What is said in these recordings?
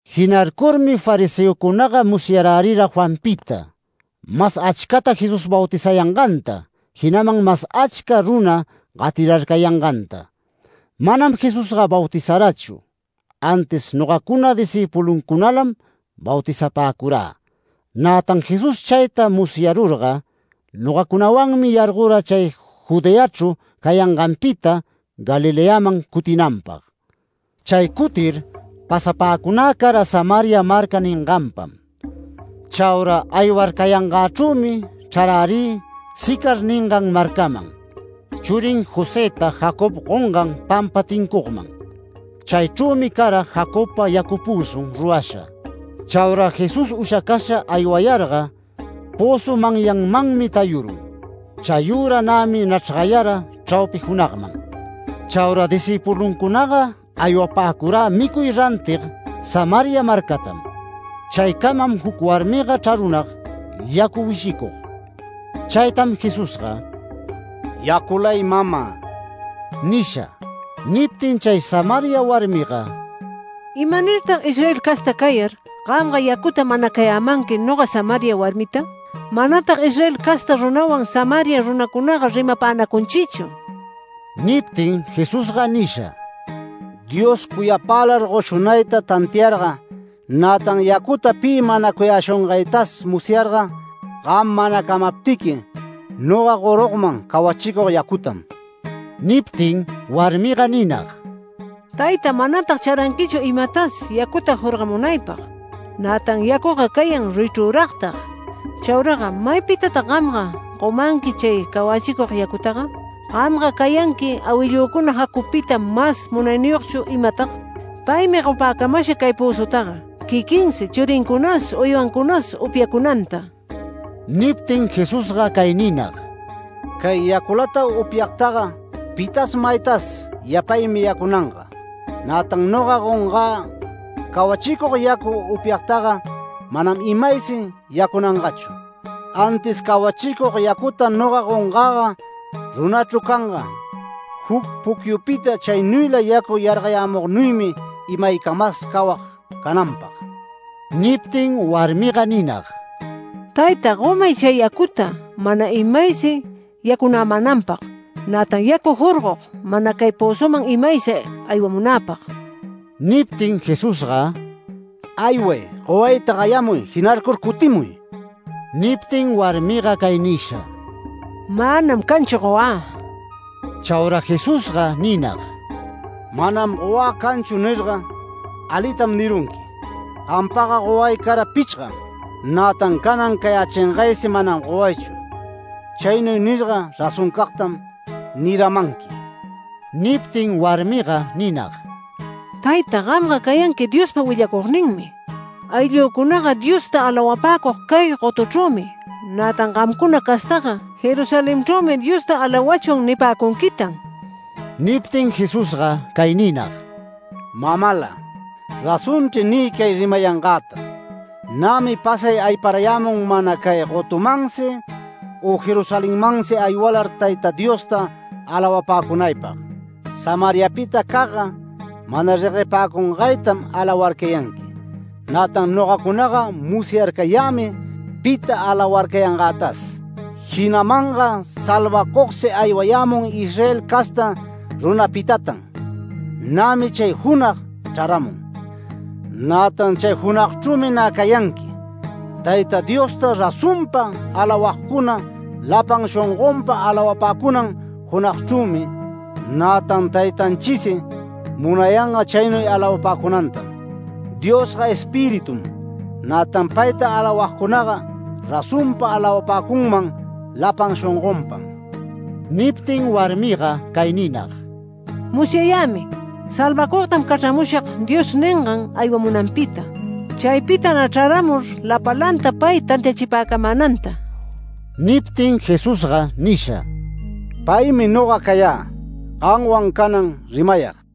Jinarcurmi fariseocunaga musyarärira Juanpita, mas achcata Jesús bautizayanganta, jinaman mas achca runa gatirarcayanganta. Manam Jesusga bautizarachu, antis nogacuna discïpuluncunalam bautizapäcurä. Nätan Jesús chayta musyarurga nogacunawanmi yargora chay Judeachru cayanganpita Galileaman cutinanpag. Chay cutir, pasapäcunä cara Samaria marca ninganpam. Chaura aywarcayangächrümi chrarärï Sicar ningan marcaman, churin Josëta Jacob gongan pampa tincugman. Chaychrümi cara Jacobpa yacu pözun rurasha. Chaura Jesús ushacasha aywayarga, pözu manyanmanmi tayurun. Chayüra nämi nachrgayara chraupi junagman. Chaura discïpuluncunaga aywapäcurä micuy rantig Samaria marcatam. Chaycamam juc warmiga chrarunag yacu wishicug. Chaytam Jesusga “Yaculay mama” nisha. Niptin chay Samaria warmiga “¿Imanirtag Israel casta cayar, gamga yacuta manacayämanqui noga Samaria warmita? Manatag Israel casta runawan Samaria runacunaga rimapanacunchichu”. Niptin Jesusga nisha: “Dios cuyapälar goshunayta tantiarga, nätan yacuta pi manacuyäshungaytas musyarga, gam manacamaptiqui, noga gorugman cawachicug yacutam”. Niptin warmiga ninag: “Tayta, manatag charanquichu imatas yacuta jorgamunaypag, nätan yacuga cayan ruyichrüragtag. Chauraga ¿maypitatag gamga gomanqui chay cawachicug yacutaga? ¿Gamga cayanqui awillücuna Jacobpita mas munayniyogchu imatag? Paymi gopäcamasha cay pözutaga, quiquinsi churincunas uywancunas upyacunanta”. Niptin Jesusga cay ninag: “Cay yaculata upyagtaga pitas maytas yapaymi yacunanga. Nätan noga gongä cawachicug yacu upyagtaga, manam imaysi yacunangachu. Antis cawachicug yacuta noga gongäga runachru canga, juc pucyupita chaynuyla yacu yargayämugnuymi imaycamas cawag cananpag”. Niptin warmiga ninag: “Tayta, gomay chay yacuta mana imaysi yacunämänanpag, nätan yacu jorgog mana cay pözuman imaysi aywamunäpag”. Niptin Jesusga “Ayway, gowayta gayamuy, jinarcur cutimuy”. Niptin warmiga cay nisha: “Manam canchu gowä”. Chaura Jesusga ninag: “ ‘Manam gowä canchu’ nirga, alitam nirunqui. Gampaga goway cara pichgam, nätan canan cayächingaysi manam gowaychu. Chaynuy nirga razoncagtam niramanqui”. Niptin warmiga ninag: “Tayta, gamga cayanqui Diospa willacugninmi. Awillücunaga Diosta alawapäcug cay gotuchrümi. Nätan gamcuna castaga ‘Jerusalenchrümi Diosta alawachwan’ nipäcunquitan”. Niptin Jesusga cay ninag: “Mamala, razonchri nï cay rimayangäta: Nämi pasay ayparayämun mana cay gotumansi u Jerusalenmansi aywalar Tayta Diosta alawapäcunaypag. Samariapitacagga mana reguepäcungaytam alawarcayanqui, nätan nogacunaga musyarcayämi pita alawarcayangätas. Jinamanga salvacugsi aywayämun Israel casta runapitatan. Nämi chay junag chraramun. Nätan chay junagchrümi nä cayanqui Tayta Diosta razonpa alawagcuna, lapan shongonpa alawapäcunan junagchrümi. Nätan Taytanchisi munayanga chaynuy alawapäcunantam. Diosga Espiritum, nätan payta alawagcunaga razonpa alawapäcunman lapan shongonpam”. Niptin warmiga cay ninag: “Musyayämi ‘Salvacugtam cachramushag’ Dios ningan aywamunanpita. Chaypita nä chraramur lapalanta pay tantiachipäcamänanta”. Niptin Jesusga nisha: “Paymi noga cayä, gamwan canan rimayag”.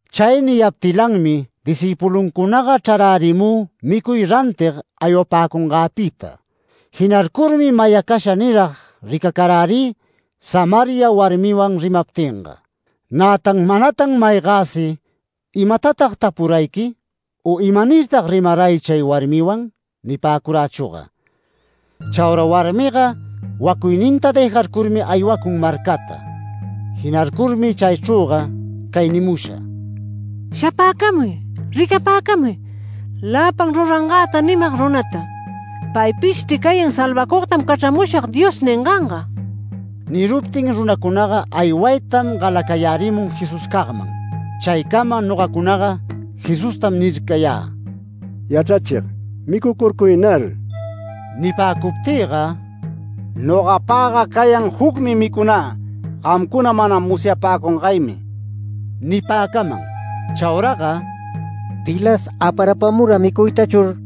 Chay niyaptilanmi discïpuluncunaga chrarärimü micuy rantig aywapäcungäpita. Jinarcurmi mayacasha nirag ricacarärï Samaria warmiwan rimaptinga. Nätan manatan maygäsi “¿Imatatag tapurayqui? u ¿imanirtag rimaray chay warmiwan?” nipäcurachüga. Chaura warmiga wacuyninta dëjarcurmi aywacun marcata. Jinarcurmi chaychrüga cay nimusha: “Shapäcamuy. Ricapäcamuy, lapan rurangäta nimag runata. ¡Paypishchri cayan ‘Salvacugtam cachramushag’ Dios ninganga!” Niruptin runacunaga aywaytam galacayärimun Jesuscagman. Chaycama nogacunaga Jesustam nircayä: “Yachrachig, micucurcuynar”. Nipäcuptïga “Nogapagga cayan jucmi micunä gamcuna mana musyapäcungaymi” nipäcaman. Chauraga “¿Pilas aparapamura micuytachur?”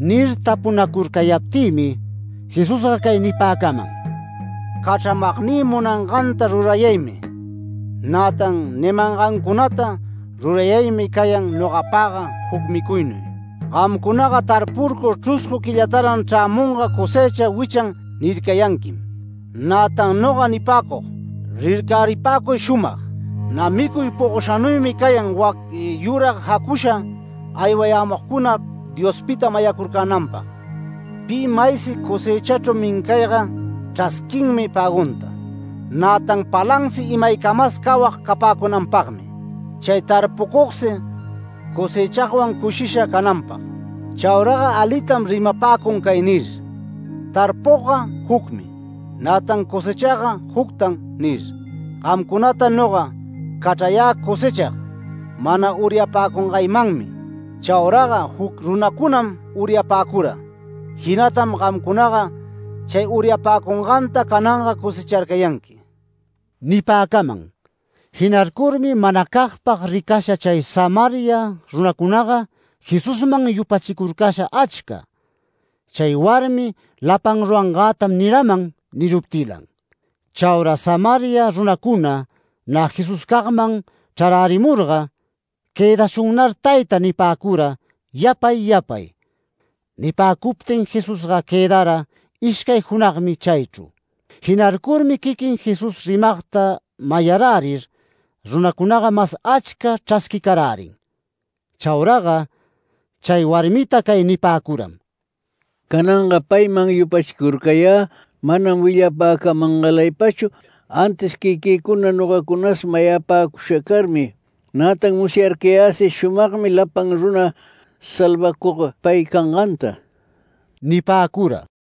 nir tapunacurcayaptïmi. Jesusga cay nipäcaman: “Cachramagnï munanganta rurayaymi, nätan nimangancunata rurayaymi cayan nogapagga juc micuynuy. Gamcunaga tarpurcur ‘Chruscu quillataran chrämunga cosëcha wichan’ nircayanquim. Nätan noga nipäcug: Rircaripäcuy shumag, nä micuy pogoshanuymi cayan wac yurag jacusha aywayämugcuna Diospita mayacurcänanpag. Pi maysi cosëchachru mincayga chrasquinmi pägunta, nätan palansi imaycamas cawag capäcunanpagmi, chay tarpucugsi cosechagwan cushisha cananpag. Chauraga alitam rimapäcun cay nir: ‘Tarpugga jucmi, nätan cosechagga juctan’ nir. Gamcunata noga cachrayä cosechag, mana uryapäcungaymanmi. Chauraga juc runacunam uryapäcura. Jinatam gamcunaga chay uryacurcanganta cananga cosecharcayanqui” nipäcaman. Jinarcurmi manacagpag ricasha chay Samaria runacunaga Jesusman yupachicurcasha achca, chay warmi “Lapan rurangätam niraman” niruptilan. Chaura Samaria runacuna nä Jesuscagman chrarärimurga “Quëdashunnar tayta” nipäcura yapay yapay. Nipäcuptin Jesusga quëdara ishcay junagmi chaychru. Jinarcurmi quiquin Jesús rimagta mayarärir runacunaga mas achca chrasquicarärin. Chauraga chay warmita cay nipäcuram: “Cananga payman yupachicurcayä manam willapacamangalaypachu, antis quiquïcuna nogacunas mayapäcusha carmi. Nätan musyarcayäsi shumagmi lapan runa salvacug pay canganta” nipäcura.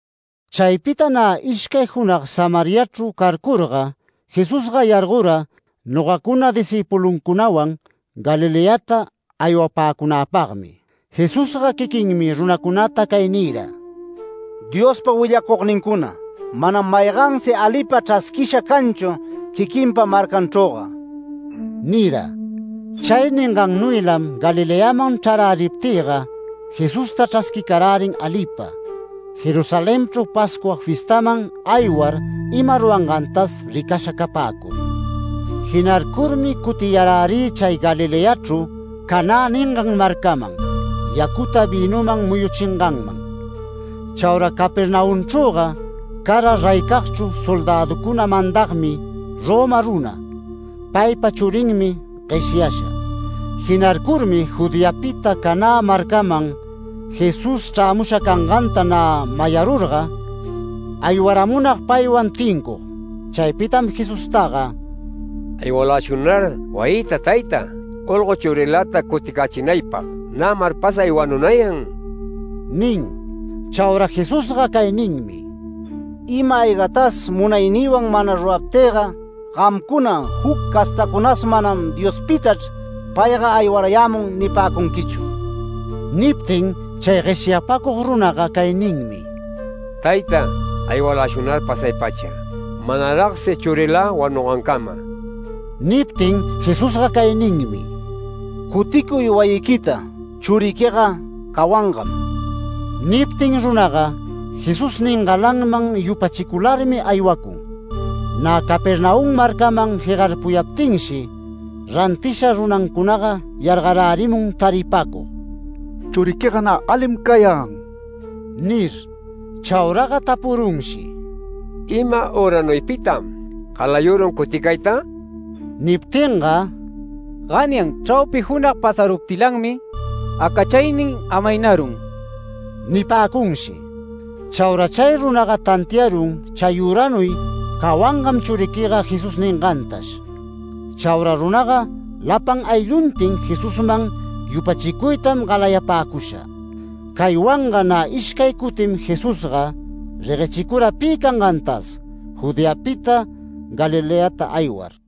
Chaypita nä ishcay junag Samariachru carcurga Jesusga yargora, nogacuna discïpuluncunawan Galileata aywapäcunäpagmi. Jesusga quiquinmi runacunata cay nira: “Diospa willacugnincuna, manam maygansi alipa chrasquisha canchu quiquinpa marcanchrüga” nira. Chay ningannuylam Galileaman chraräriptïga, Jesusta chrasquirärin alipa, Jerusalenchru Pascua fiestaman aywar ima rurangantas ricasha capäcur. Jinarcurmi cutiyarärï chay Galileachru, Canä ningan marcaman, yacuta vïnuman muyuchinganman. Chaura Capernaumchrüga cara reycagchru soldäducuna mandagmi Roma runa. Paypa churinmi gueshyasha. Jinarcurmi Judeapita Canä marcaman Jesús chrämusha canganta nä mayarurga aywaramunag paywan tincug. Chaypitam Jesustaga “Aywaläshunnar wayïta tayta, olgo churiläta cuticächinaypag. Nämar pasay wanunayan” nin. Chaura Jesusga cay ninmi: “Ima-aygatas munaynïwan mana ruraptïga, gamcuna juc castacunas manam ‘Diospitachr payga aywarayämun’ nipäcunquichu”. Niptin chay gueshyapacug runaga cay ninmi: “Tayta, aywaläshunnar pasay-pacha, manaragsi churilä wanungancama”. Niptin Jesusga cay ninmi: “Cuticuy wayiquita. Churiquiga cawangam”. Niptin runaga Jesús ningalanman yupachicularmi, aywacun. Nä Capernaum marcaman jegarpuyaptinshi, rantisha runancunaga yargarärimun taripacug: “Churiquiga nä alim cayan” nir. Chauraga tapurunshi: “¿Ima üranuypitam galayurun cuticayta?” Niptinga “Ganyan chraupi junag pasaruptilanmi acachaynin amaynarun” nipäcunshi. Chaura chay runaga tantiarun chayüranuy “Cawangam churiquiga” Jesús ningantash. Chaura runaga lapan aylluntin Jesusman yupachicuytam galayapäcusha. Caywanga nä ishcay cutim Jesusga reguechicura pi cangantas Judeapita Galileata aywar.